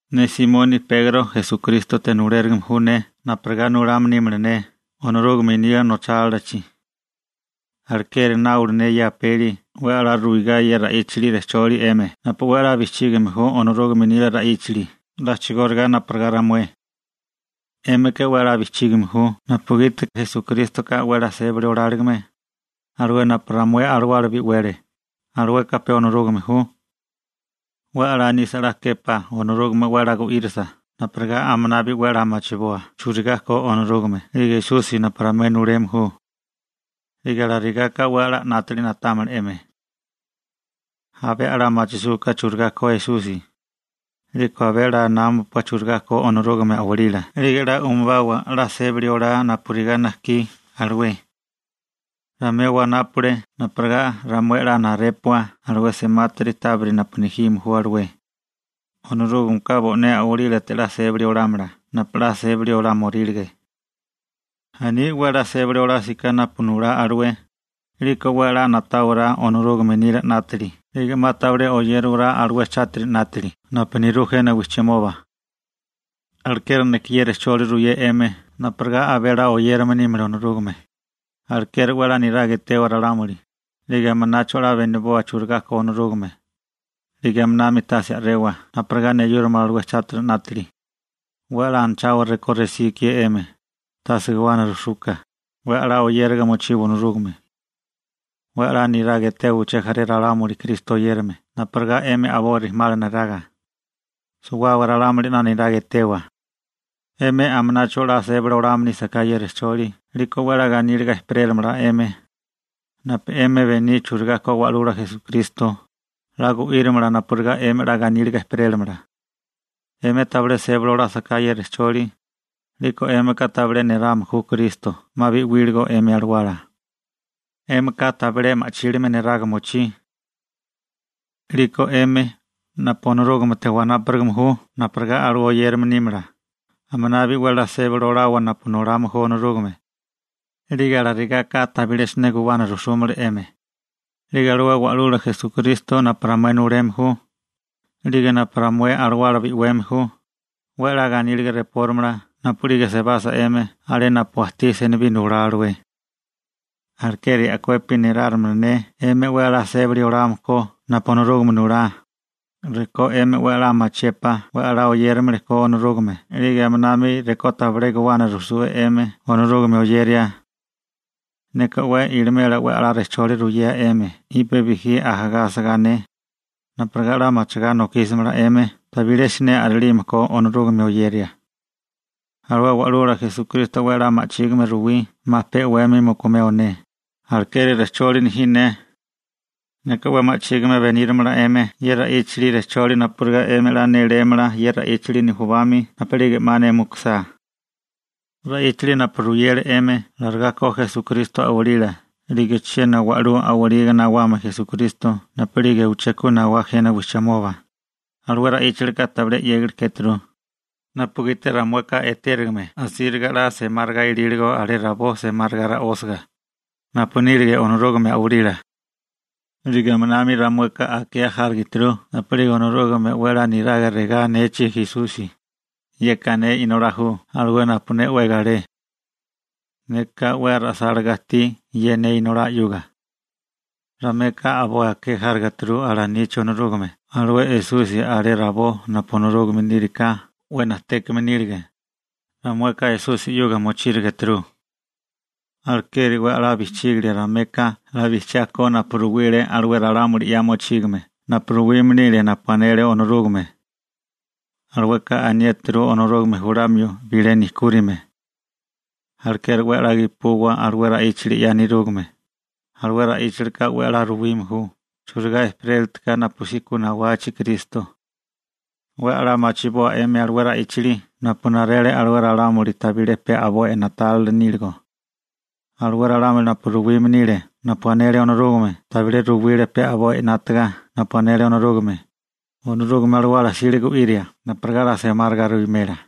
Ne Simoni Pegro Esukrístote nulérigime ju ne napurigá nulame nímala ne Onorúgame nila nochálilachi. Alekeri náule ne ye apeli 'we 'la ruigá ye ra'íchali rejcholi 'emi napu 'we 'la bijchígame ju Onorúgame nila ra'íchali a'chigóriga napurigá ramué. 'Émika 'we 'la bijchígame ju napugiti Esukrístoka 'we 'la sébali oláligime, alué napu ramué alawala bi'wele. Alueka pe Onorúgame ju. 'We 'la nisa 'la képá Onorúgame 'we 'la gu'írasa napurigá aminabi 'we 'la machiboa churigá ko Onorúgame 'lige Esusi napu ramué nuleme ju. 'Lige alarigaka 'we 'la 'nátili na'támala 'emi. Abé 'la machisúká churigá ko Esusi, 'liko abé 'la námapua churigá ko Onorúgame a'walila, 'lige 'la umubawa 'la sébali olá napurigá najkí alué. Ramué wanápale napurigá ramué 'la narépua alué semátiri tábiri napu nejime ju alué. Onorúgameka bo'né a'walílate 'la sébali olámala napu 'la sébali olámorílige. Aní 'we 'la sébali olásiká napu nulá alué, 'liko 'we 'la na'táwará Onorúgame nila 'nátali 'lige 'ma tabilé oyérawará alué chátiri 'nátali napu nerú jena wijchimoba. Alekeri neka ye rejcholi ruyé 'emi napurigá abé 'la oyérame nímala Onorúgame: Alekeri 'we 'la niraga etewa ralámuli, 'lige aminacho 'la beniboa churigá ko Onorúgame, 'lige aminami tase a'rewa napurigá neyúramala alué chátiri 'nátali. 'We 'la anachawa rekó resí ikié 'emi, tase guwana rujsuka, 'we 'la oyériga mochiwa Onorúgame. 'We 'la niraga etewa uché jaré ralámuli Kristo oyérame napurigá 'emi a'boi rijimala neraga. Suwábaga ralámuli 'la niraga etewa. 'Emi aminacho 'la sébali olame nísaká ye rejcholi 'liko 'we 'la ganíliga ejperéramala 'emi. Napu 'emi bení churigá ko Wa'lula Esukristo, 'la gu'írimala napurigá 'emi 'la ganíliga ejperélamala. 'Emi tabilé sébali olásaká ye rejcholi, 'liko 'émika tabilé néráme ju Kristo 'ma bi'wíligo 'emi alawala. 'Émika tabilé ma'chílime neraga mochí. 'Liko 'emi napu Onorúgamete wanápurigame ju napurigá alué oyérame nímala, aminabi 'we 'la sébali olawa napu nulame ju Onorúgame. 'Lige alarigaka tabilé siné guwana rujsúmala 'emi. 'Lige alué Wa'lula Esukristo napu ramué nuleme ju, 'lige napu ramué alawala bi'weme ju, 'we 'la ganíliga rejpórimala napu'lige sebasa 'emi alé napu ajtí senibí nulá alué. Alekeri a'kuepi néláramala ne 'emi 'we 'la sébali oliame ko napu Onorúgame nulá, rekó 'emi 'we 'la machiépá 'we 'la oyérilime ko Onorúgame 'lige aminami rekó tabilé guwana rujsue 'emi Onorúgame oyeria. Neka 'we ilimela 'we 'la rejcholi ruyea 'emi jipe bijí ajagá asagá ne, napurigá 'la machigá nokísamala 'emi tabilé siné a'rilime ko Onorúgame oyeria. Alué Wa'lula Esukristo 'we 'la ma'chígime ruwí 'ma pe 'wemi mukumeo ne, alekeri rejcholi nejí ne. Neka 'we ma'chígime benírimala 'emi ye ra'íchali rejcholi napurigá 'emi 'la nélémala ye ra'íchali nujubami napu'lige 'ma mukusá ne. Ra'íchali napu ruyeru 'emi larigá ko Esukristo a'walila 'lige chiena wa'lú a'waliga nawamio Esukristo napu'lige uché ku nawá jena wijchimoba, alué ra'íchalika tabilé 'yégali kéturu, napugiti ramueka etérigame asíriga 'la semáriga ilíligo alé rabó semáriga ra'ósiga, napu nílige Onorúgame a'walila, 'lige aminami ramueka akea járigeturu napu'lige Onorúgame 'we 'la niraga regá anechi Esusi: «Yeka ne Inolá ju alué napu ne 'we galé. Neka 'we ra'sálagá ajtí ye ne Inolá 'yuga.» Ramueka a'boi akea járigeturu alanechi Onorúgame alué Esusi alé rabó napu Onorúgame níriká 'we najtékame nílige, ramueka Esusi 'yuga mochírigeturu. Alekeri 'we 'la bijchígilia ramueka 'la bijchiá ko napu ruwile alué ralámuli 'ya mochígame napu ruwime nile napu anele Onorúgame. Alueka aniéturu Onorúgame julamio bilé nejkúrime. Alekeri 'we 'la gepuwa alué ra'íchali 'ya nerúgame, alué ra'íchilika 'we 'la ruwime ju churigá ejperélitiká napusí ku nawachi Kristo. 'We 'la machiboa 'emi alué ra'íchali napu narele alué ralámuli tabilé pe a'boi na'tálila níligo. Alué ralámuli napu ruwime nile napu anele Onorúgame tabilé ruwile pe a'boi 'nátaga napu anele Onorúgame, Onorúgame Alawala 'sile gu'iria napurigá 'la semáriga ruwimela.